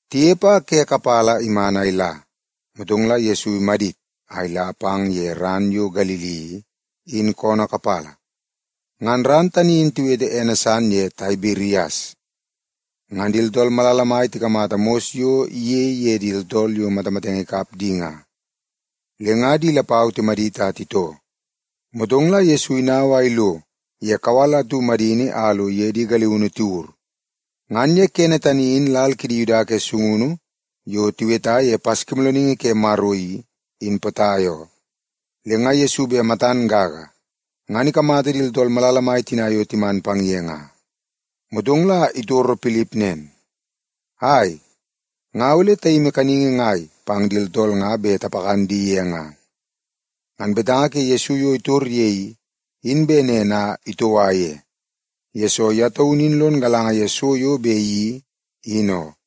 Tinepe a ke kapala iman a ila, motong la Yesu imadit a ila pang ye ran yo Galili i, in koonoo kapala. Ngan ran tani in tiwete ene san ye Taibirias. Ngan di tooltool malala mai tikamata mos yo iyei ye di tooltool yo matamatenge ikap di nga, le nga di lapau timadit a titoo. Motong la Yesu inau a ilo ye kawal atu madini a lo iye di galiunu tiwur. Ngan ye kene tani in, lal kidi Yuda ke sungunu yo tiweta ye Paskimoolooningi ke Maro i, in potai oo. Le nga Yesu bet matan gaga, ngan ikamata di tooltool malala mai tina yo timan pang ye nga, motong la itoro Pilip nen, “Ai, nga ole tayimi kaningi ngai pang di tooltool nga bet tapakan di ye nga?” Ngan betanga ke Yesu yo itor ye i, in bet nen a itoua ye, yesoo ye taunu in lon galanga ye so yo bet iyeii, in oo.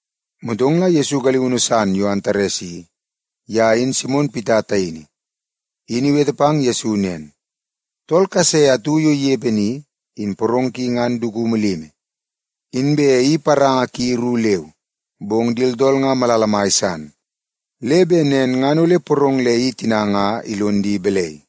Motong la Yesu galiunu san yo Antares i, ye in Simon Pita taini, in iwete pang Yesu nen, “Tool kase atu yo inepe ni, in porong ki nga dukumu limi, inbe i paranga ki ru leu. Bong di tooltool nga malala mai san. Le bet nen ngan ole porong le i tina nga ilonidi balai?”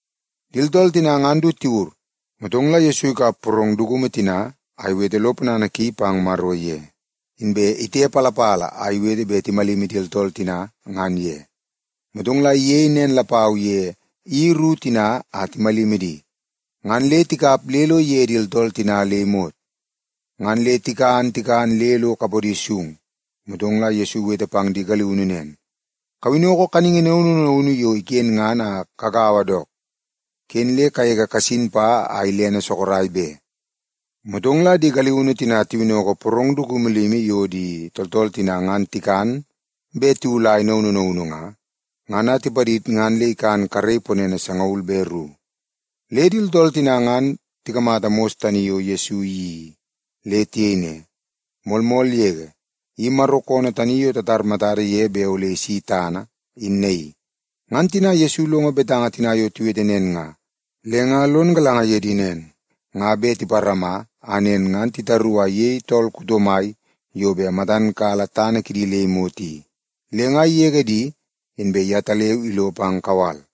Di tooltool tina ngan du tiwur, motong la Yesu ikap porong dukumu tina a iwete lo ponana ki pang Maro ye, inbe itepalapala a iwete bet timalimi di tooltool tina ngan ye. Motong la iyei nen lapau ye i ru tina a timalimi di, ngan le tikap le lo ige di tooltool tina le imot. Ngan le tikan tikan le lo kapodi sung, motong la Yesu iwete pang di galiunu nen, “Kawinnoko kaningi naunu naunu yo iken ngan a kagaua dook, ken le kagege kasin pa a ilene sorok be.” Motong la di galiunu tina tiwinnoko porong dukumu limi yo di tooltool tina ngan tikan bet tiwulai naunu naunu nga, ngan a tipadid ngan le ikan karei ponene sangaul be ru. Le di tooltool tina ngan tikamata mos tani yo Yesu iyeii i, le tiyei ne, “Moolmool yege, i Maro koonoo tani yo tatar matada ye bet ole isi tana, in naii.” Ngan Yesu ilongo tina yo tiwete nen nga, le nga lon galanga ye di nen, nga bet tiparama a nen ngan titaru a iyei tool kuto mai yo bet matan kala tana kidi le imot i. Le nga igege di, inbe yetaleu ilo pang kawal.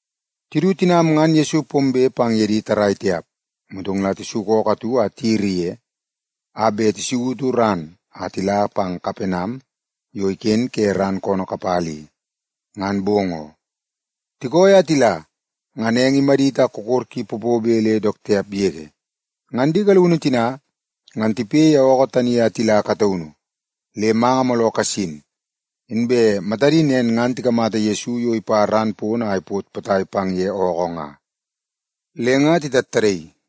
Tidu, tinam ngan Yesu pombe pang ye di tarrai tiap. Motong la tisuku ookoo atu a tiyiri ye, a bet tisautu ran a tila pang Kapenam yo iken ke ran koonoo kapala i, ngan bong oo. Tikooi a tila, ngan eng mai imadit a kokor ki popobe le dook tiap yege. Ngan di galiunu tina, ngan tipoi ye ookoo tani a tila kataunu, le manga mooloo kasin. Inbe matadi nen ngan tikamata Yesu yo ipa ran pono a ipot potai pang ye ookoo nga, le nga titattadaii.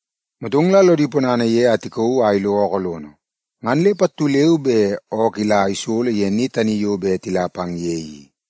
Motong la lodi ponana ye a tikauu a ilo ookoo lono, ngan le pattu leu be ookoo ila isolo ye ni tani yo bet tila pang ye i.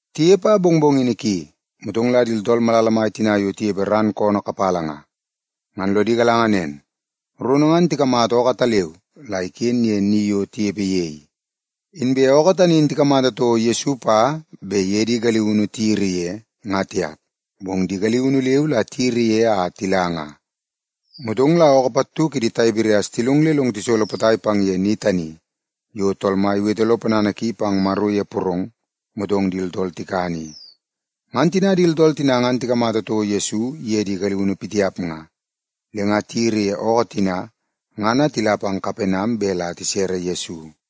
Tinepe a mongmongini ki, motong la di tooltool malala mai tina yo tinepe ran koonoo kapala nga, ngan lodi galanga nen, rono ngan tikamata ookoo ataleu la iken ye ni yo tinepe ye i. Inbe ookoo tani in tikamata toko Yesu pa bet iye di galiunu tiyiri ye, nga tiap, bong di galiunu leu la tiyiri ye a tila nga. Motong la ookoo pattu kidi Taibirias tilong le long tisolo potai pang ye ni tani yo Tool Mai iwete lo ponana ki pang Maro ye porong, motong di tooltool tikan i. Ngan tina di tooltool tina ngan tikamata toko Yesu iye di galiunu pitiap nga, le nga tiyiri ye ookoo tina ngan a tila pang Kapenam bet la tisere Yesu.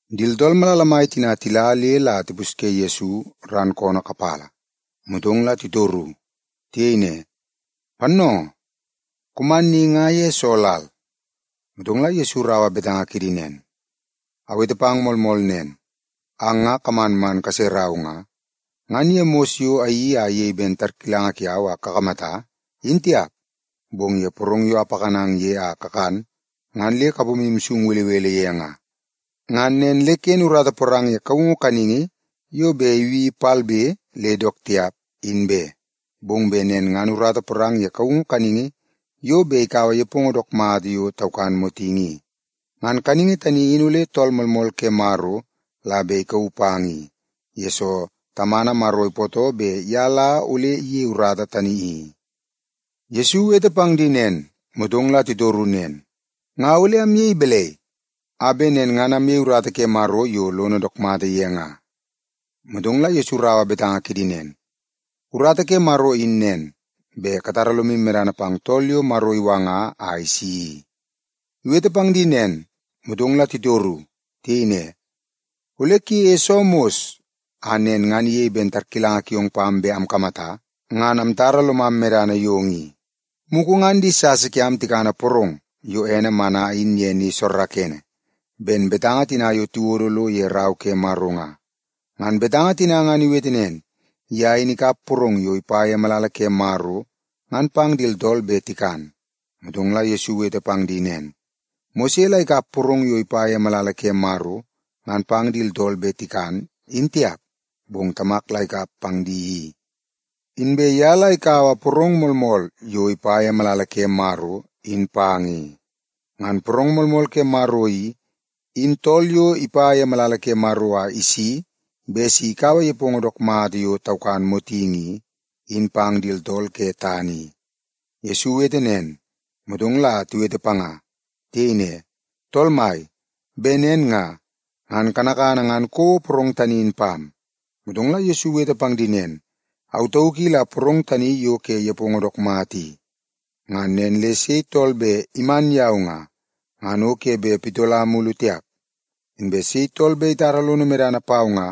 Di tooltool malala mai tina tila le la tipusye Yesu ran koonoo kapala, motong la titoru. Tiyei ne, “Pannoongoo, kuman ni nga ye soo lal?” Motong la Yesu iraua betanga kidi nen, “Awete pang moolmool nen, ang nga kaman kaserau nga, ngan ye mos yo ayeii a iyei ben tarkilanga kiau a kakamata, in tiap, bong ye porong yo apakanang ye a kakan ngan le kapomu sung belebele ye nga. Ngan nen le ken urata porang ye kaungu kaningi yo bet ibi palbe le dook tiap, in be, bong bet nen ngan urata porang ye kaungu kaningi yo bet ikaua nepongo dook mata yo taukan motingi i. Ngan kaningi tani in ole Tool Moolmool ke Maro la bet ikauu pang i, yesoo Tamana Maro ipootoo bet ye la ole iyei urata tani i.” Yesu iwete pang di nen, motong la titoru nen, “Nga ole amyei balai a bet nen ngan amyei urata ke Maro yo lono dook mata ye nga?” Motong la Yesu iraua betanga kidi nen, “Urata ke Maro in nen, bet katara lomu medana pang tool yo Maro iwanga a isi i.” Iwete pang di nen, motong la titoru. Tiyei ne, “Ole kuyeie soo mos a nen ngan iyei ben tarkilanga kiong pam bet amkamata, ngan amtara lomam medana yong i? Mugu ngan di sasa kiam tikana porong yo ene mana in ye ni soorookoonoo, ben betanga tina yo tiwodo lo ye Rau ke Maro nga. Ngan betanga tina ngan iwete nen, ‘Ye in ikap porong yo ipa ye malala ke Maro, ngan pang di tooltool bet tikan.’” Motong la Yesu iwete pang di nen, “Mose la ikap porong yo ipa ye malala ke Maro ngan pang di tooltool bet tikan, in tiap, bong Tamak la ikap pang di i. Inbe ye la ikaua porong moolmool yo ipa ye malala ke Maro, in pang i. Ngan porong moolmool ke Maro i, in tool yo ipa ye malala ke Maro a isi bet si ikaua nepongo dook mata yo taukan motingi i, in pang di tooltool ke tana i.” Yesu iwete nen, motong la tiwete panga. Tiyei ne, “Tool mai, bet nen nga, ngan kanakana ngan kouo porong tani in pam.” Motong la Yesu iwete pang di nen, “Au tauk i la porong tani yo ke nepongo dook mata i. Ngan nen le sei tool bet iman yau nga, ngan o ke bet pitola mulu tiap. Inbe sei tool bet itara lono medana pau nga,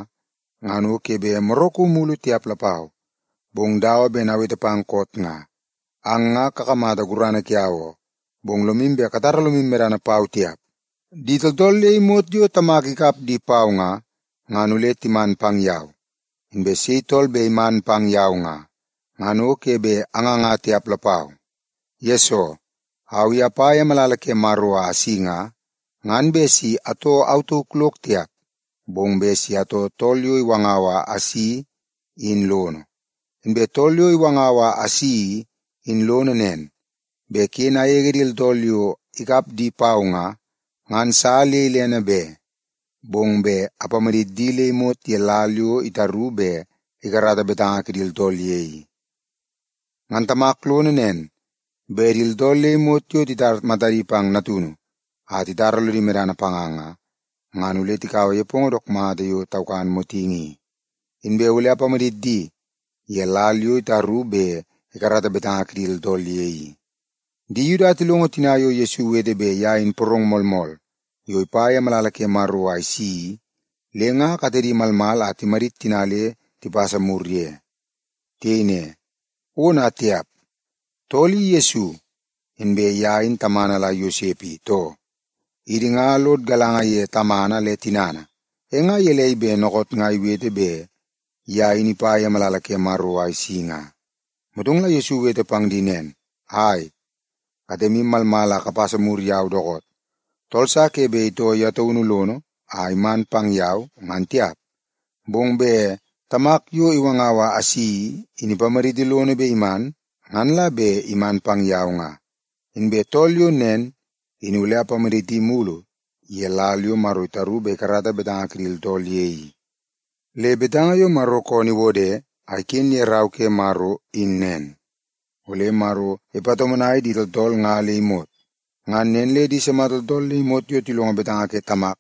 ngan o ke bet moraku mulu tiap lapau. Bong dawa ben awete pang koot nga, ang nga kakamata gurana kiau oo, bong lomu bet katara lomu medana pau tiap. Di tooltool le imot yo Tamak ikap di pau nga, ngan ole timan pang yau. Inbe sei tool bet iman pang yau nga, ngan o ke bet anganga tiap lapau. Yesoo, au i apa ye malala ke Maro a asi nga, ngan bet si atoo au tauk lok tiap, bong bet si atoo Tool yo iwangau a asi i, in lono. Inbe Tool yo iwangau a asi i, in lono nen, bet ken agege di tooltool yo ikap di pau nga, ngan sa le ilene be. Bong bet apamadit di le imot ye lal yo itaru bet ikarata betanga kidi tooltool ye i. Ngan Tamak lono nen, bet di tooltool le imot yo titar matadi pang Natunu a titara lodi medana panga nga, ngan ole tikaua nepongo dook mata yo taukan motingi i, inbe ole apamadit di ye lal yo itaru bet ikarata betanga kidi tooltool ye i.” Di Yuda tilongo tina yo Yesu iwete bet ye in porong moolmool yo ipa ye malala ke Maro a isi i, le nga katedi malmal a timadit tina le tipasa mur ye. Tiyei ne, “Ona tiap! Tool i Yesu, inbe ye in tamana la Yosep i, too? Idi nga lod galanga ye tamana le tinana, e nga gelei bet dookoot nga iwete bet ye in ipa ye malala ke Maro a isi nga?” Motong la Yesu iwete pang di nen, “Ai, katemu malmal a kapasa mur yau dookoot! Tool sa ke bet itoo ye taunu lono a iman pang yau, ngan tiap, bong bet Tamak yo iwangau a asi i, in ipamaditi lono bet iman, ngan la bet iman pang yau nga. Inbe tool yo nen, in ole apamaditi mulu ye lal yo Maro itaru bet ikarata betanga kidi tooltool ye i. Le betanga yo Maro koonoo iwode a iken ye Rau ke Maro in nen, ‘Ole Maro ipatomonai di tooltool nga le imot.’ Ngan nen le di sima tooltool le imot yo tilongo betanga ke Tamak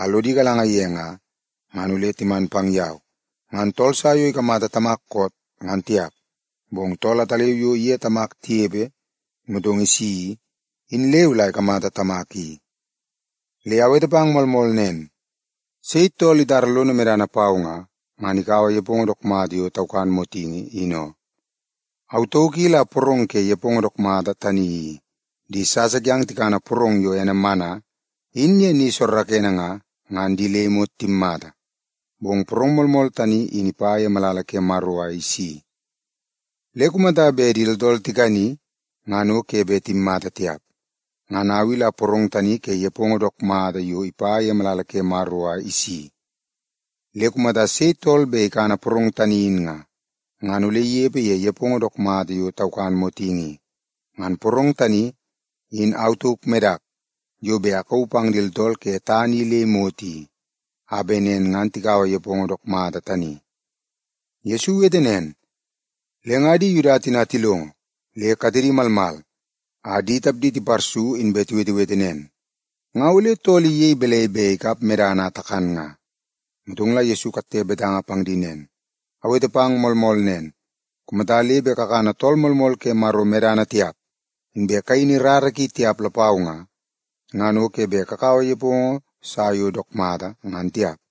a lodi galanga ye nga, ngan ole timan pang yau. Ngan tool sa yo ikamata Tamak koot, ngan tiap, bong tool ataleu yo iye Maro tinepe motong isi i, in leu la ikamata Tamak i. Le awete pang moolmool nen, sei tool itara lono medana pau nga, ngan ikaua nepongo dook mata yo taukan motingi i, in oo. Au tauk i la porong ke nepongo dook mata tani i. Di sasa kiang tikana porong yo ene mana, in ye ni soorookoonoo nga, ngan di le imot timmata. Bong porong moolmool tani in ipa ye malala ke Maro a isi, le kumata bet di tooltool tikani, ngan o ke bet timmata tiap. Ngan au i la porong tani ke nepongo dook mata yo ipa ye malala ke Maro a isi i. Le kumata sei tool bet ikana porong tani in nga, ngan ole inepe ye nepongo dook mata yo taukan motingi i. Ngan porong tani in au tauk medak yo bet akauu pang di tooltool ke tana i le imot i, a bet nen ngan tikaua nepongo dook mata tani.” Yesu iwete nen, le nga di Yuda tina tilongo, le katedi malmal a di tapdi tiparsu inbe tiwetewete nen, “Nga ole tool i iyei balai bet ikap medana a takan nga?” Motong la Yesu ikatte betanga pang di nen, “Awete pang moolmool nen, kumata le bet kakana Tool Moolmool ke Maro medana tiap, inbe kayini rara ki tiap lapau nga, ngan o ke bet kakaua nepongo sa yo dook mata, ngan tiap.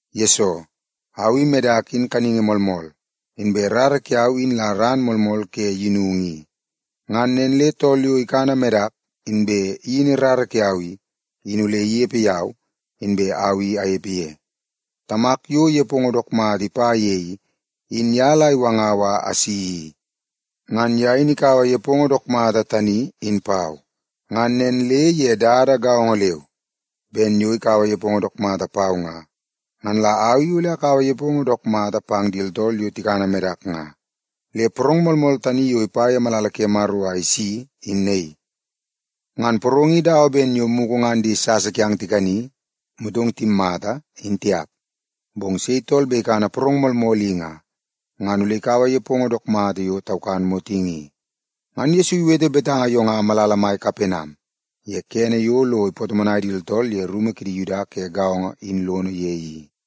Yesoo, au medak in kaningi moolmool, inbe rara kiau in la ran moolmool ke yinungu i. Ngan nen le tool yo ikana medak bet iyin rara kiau i, in ole inepe yau, inbe au i anepe ye. Tamak yo nepongo dook mata ipa ye i, in ye la iwangau a asi i. Ngan ye in ikaua nepongo dook mata tani in pau. Ngan nen le ye dada gaongo leu ben yo ikaua nepongo dook mata pau nga, ngan la au i ole akaua nepongo dook mata pang di tooltool yo tikana medak nga. Le porong moolmool tani yo ipa ye malala ke Maro a isi, in naii. Ngan porong i dawa ben yo mugu ngan di sasa kiang tikani, motong timmata, in tiap. Bong sei tool bet ikana porong moolmool i nga, ngan ole ikaua nepongo dook mata yo taukan motingi i.” Ngan Yesu iwete betanga yo nga malala mai Kapenam, ye kene yo lo ipatomonai di tooltool ye rumu kidi Yuda ke gaongo in lono ye i.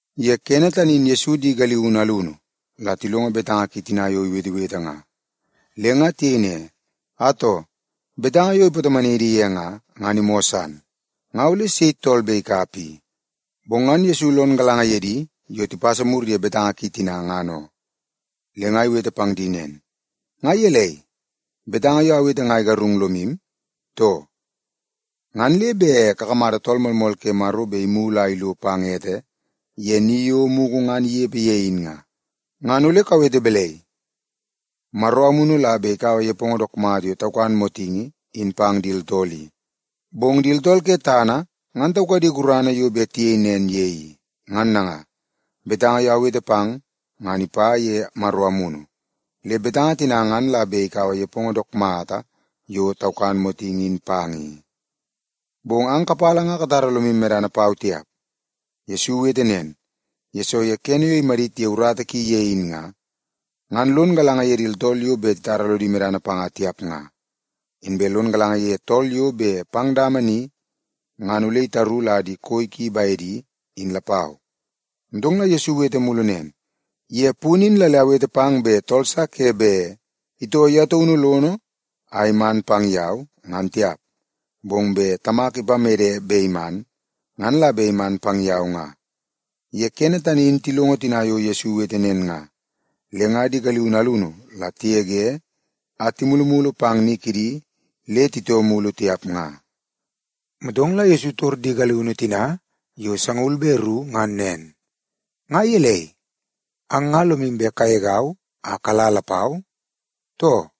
Ye kene tani in Yesu di galiunu alunu la tilongo betanga ki tina yo iwetewete nga, le nga tiyei ne, “Atoo, betanga yo ipatomonai idi ye nga, ngan imoo san. Nga ole sei tool bet ikap i?” Bong ngan Yesu lon galanga ye di yo tipasa mur ye betanga ki tina, ngan oo. Le nga iwete pang di nen, “Nga gelei, betanga yo awete nga igarung lomu, too? Ngan le bet kakamata Tool Moolmool ke Maro bet imulu a ilo pang ete ye ni yo mugu ngan inepe ye in nga, ngan ole kawete balai? Maro Amunu la bet ikaua nepongo dook mata yo taukan motingi in pang di tooltool i. Bong di tooltool ke tana ngan taukadi gurana yo bet tiyei nen ye i. Ngan nanga, betanga yo awete pang ngan ipa ye Maro Amunu, le betanga tina ngan la bet ikaua nepongo dook mata yo taukan motingi in pang i. Bong ang kapala ngan katara lomu medana pau tiap.” Yesu iwete nen, yesoo ye kene yo imadit ye urata ki ye in nga, ngan lon galanga ye di tooltool yo bet titara lodi medana panga tiap nga, inbe lon galanga ye tool yo bet pang dama ni ngan ole itaru la di koi ki bedi, in lapau. Motong la Yesu iwete mulu nen, “Ye punu in la le awete pang bet tool sa ke bet itoo ye taunu lono a iman pang yau, ngan tiap, bong bet Tamak ipamede bet iman, ngan la bet iman pang yau nga.” Ye kene tani in tilongo tina yo Yesu iwete nen nga, le nga di galiunu alunu la tigege a timulumulu pang ni kidi le titoo mulu tiap nga. Motong la Yesu itor di galiunu tina yo sangaul be ru ngan nen, “Nga gelei, ang nga lomu bet kagegau a kala lapau, too?”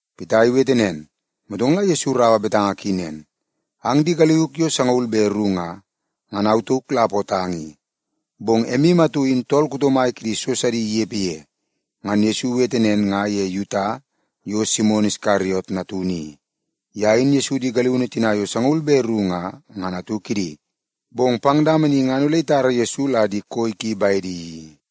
Pita iwete nen, motong la Yesu iraua betanga ki nen, “Ang di galiuk yo sangaul be ru nga, ngan au tauk la apootang i. Bong emu atu in tool kuto mai kidi so sidi inepe ye!” (Ngan Yesu iwete nen nga ye Yuta yo Simon Iskariot natunu i. Ye in Yesu di galiunu tina yo sangaul be ru nga, ngan atu kidi, bong pang dama ni ngan ole itara Yesu la di koi ki bedi i.)